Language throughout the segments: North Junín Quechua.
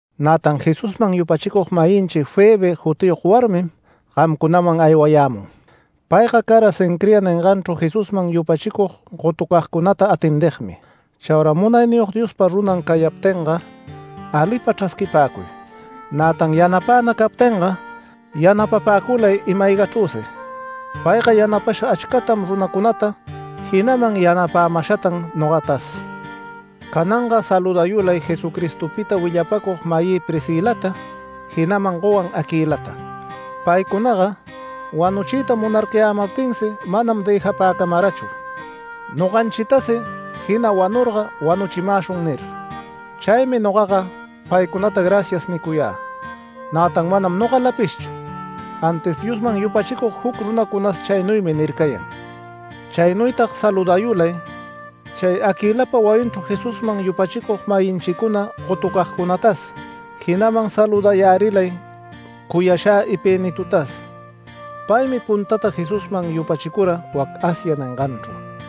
Nätan Jesusman yupachicug-mayinchi Febe jutiyog warmim gamcunam aywayämun. Payga cara Cencrea ninganchru Jesusman yupachicug gotucagcunata atendigmi. Chaura Munayniyog Diospa runan cayaptinga alipa chrasquipäcuy. Nätan yanapäna captinga yanapapäculay ima-aygachrüsi. Payga yanapasha achcatam runacunata, jinaman yanapämashatan nogatas. Cananga saludayulay Jesucristopita willapäcug-mayï Priscilata, jinaman gowan Aquilata. Paycunaga wanuchiyta munarcayämaptinsi manam dëjapäcamarachu. “Noganchitasi jina wanurga ‘Wanuchimäshun’ nir”. Chaymi nogaga paycunata “Gracias” nicuyä. Nätan manam nogalapishchu, antis Diosman yupachicug juc runacunas chaynuymi nircayan. Chaynuytag saludayulay chay Aquilapa wayinchru Jesusman yupachicug-mayinchicuna gotucagcunatas jinaman saludayärilay cuyashä Epenetotas. Paymi puntata Jesusman yupachicura wac Asia ninganchru.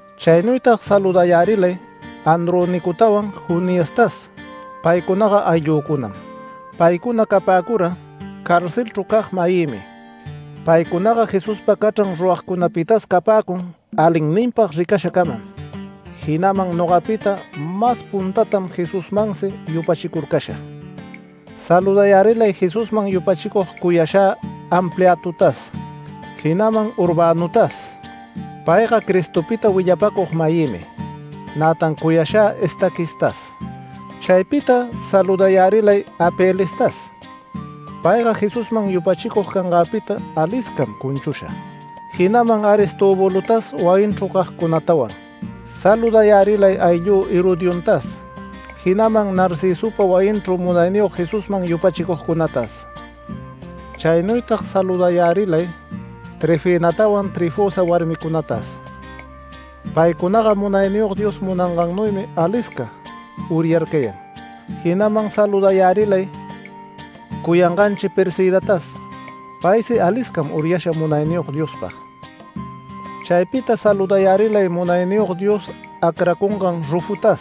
Chaynuytag saludayärilay Andronicotawan Juniastas paycunaga ayllücunam. Paycuna capäcura carcelchru cag-mayïmi. Paycunaga Jesuspa cachran ruragcunapitas capäcun alinninpag ricashacamam, jinaman nogapita mas puntatam Jesusmansi yupachicurcasha. Saludayärilay Jesusman yupachicug cuyashä Ampliatotas, jinaman Urbanotas. Payga Cristopita willapacug-mayïmi, nätan cuyashä Estaquistas. Chaypita saludayärilay Apelestas. Payga Jesusman yupachicug canganpita aliscam cunchusha, jinaman Aristobulotas wayinchru cagcunatawan. Saludayärilay ayllü, Herodiontas jinaman Narcisopa wayinchru Munayniyog Jesusman yupachicugcunatas. Chaynuytag saludayärilay Trifenatawan Trifosa warmicunatas. Paycunaga Munayniyog Dios ningannuymi alisca uryarcayan. Jinaman saludayärilay cuyanganchi Persidatas. Paysi aliscam uryasha Munayniyog Diospag. Chaypita saludayärilay Munayniyog Dios acracungan Rufotas.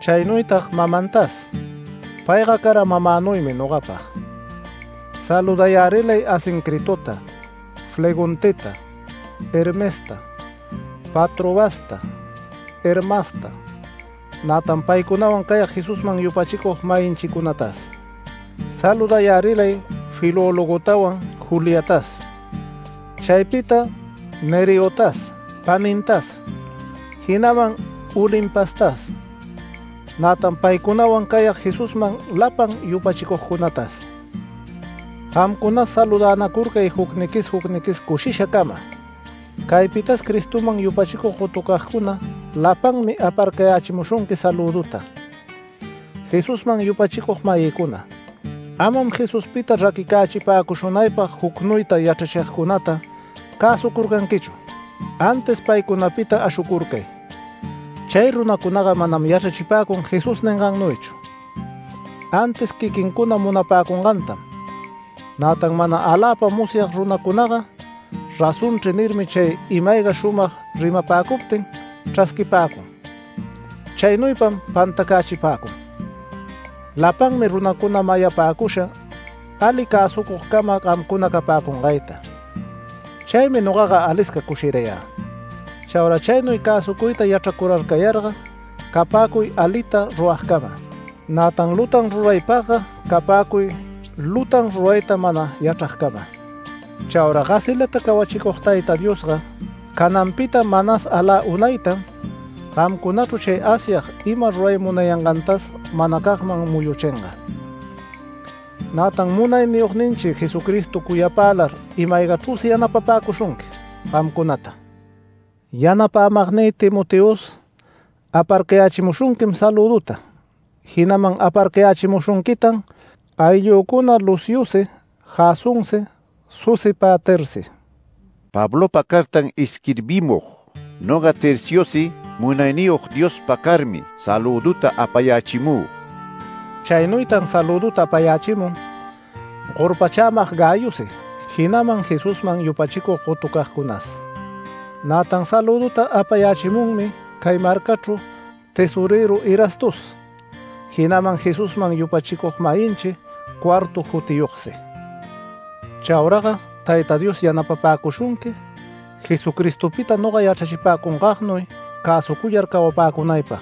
Chaynuytag mamantas. Payga cara mamänuymi nogapag. Saludayärilay Asincritota, Flegonteta, Hermesta, Patrobasta, Hermasta, nätan paycunawan cayag Jesusman yupachicug-mayinchicunatas. Saludayärilay Filologotawan, Juliatas. Chaypita Nereotas panintas, jinaman Olimpastas, nätan paycunawan cayag Jesusman lapan yupachicugcunatas. Gamcunas saludänacurcay jucniquis jucniquis, cushishacama. Caypitas Cristoman yupachicug gotucagcuna lapanmi aparcayächimushunqui salüduta. Jesusman yupachicug-mayïcuna, amam Jesuspita raquicächipäcushunaypag jucnuyta yachrachigcunata cäsucurcanquichu, antis paycunapita ashucurcay. Chay runacunaga manam yachrachipäcun Jesús ningannuychu, antis quiquincuna munapäcungantam. Nätan mana aläpa musyag runacunaga “Razonchri” nirmi chay ima-ayga shumag rimapäcuptin chrasquipäcun. Chaynuypam pantacächipäcun. Lapanmi runacuna mayapäcusha ali cäsucugcama gamcuna capäcungayta. Chaymi nogaga alisca cushirayä. Chaura chaynuy cäsucuyta yachracurarcayarga capäcuy alita ruragcama. Nätan lutan rurapagga capäcuy lutan rurayta mana yachragcama. Chaura gasilata cawachicug Tayta Diosga, cananpita manas alä unaytam, gamcunachru chay Asyag ima ruray munayangantas manacagman muyuchinga. Nätan Munayniyogninchi Jesucristo cuyapälar ima-aygachrüsi yanapapäcushunqui gamcunata. Yanapämagnï Timoteos aparcayächimushunquim salüduta jinaman aparcayächimushunquitan ayllücuna Luciosi Jasonsi Sosipatersi. Pablopa cartan isquirbimug, noga Terciosi Munayniyog Diospa carmi salüduta apayächimü. Chaynuytan salüduta apayächimun gorpachämag Gayosi jinaman Jesusman yupachicug gotucagcunas. Nätan salüduta apayächimunmi cay marcachru tesorëru Erastos, jinaman Jesusman yupachicug-mayinchi Cuarto jutiyogsi. Chauraga Tayta Dios yanapapäcushunqui Jesucristopita noga yachrachipäcungagnuy cäsucuyar cawapäcunaypag.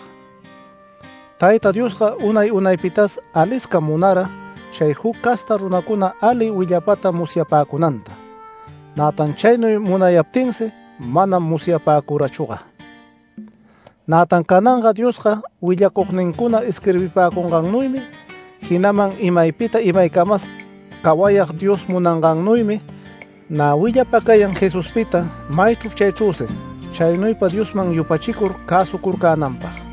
Tayta Diosga unay unaypitas aliscam munara chay juc casta runacuna ali willapata musyapäcunanta. Nätan chaynuy munayaptinsi manam musyapäcurachüga. Nätan cananga Diospa willacugnincuna isquirbipäcungannuymi, jinaman imaypita imaycamas cawayag Dios munangannuymi nä willapacayan Jesuspita maychru chaychrüsi chaynuypa Diosman yupachicur cäsucurcänanpag.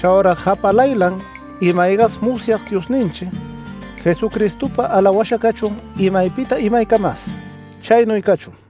Chaura japalaylan, ima-aygas musyag Diosninchi Jesucristopa alawasha cachun imaypita imaycamas. Chaynuy cachun.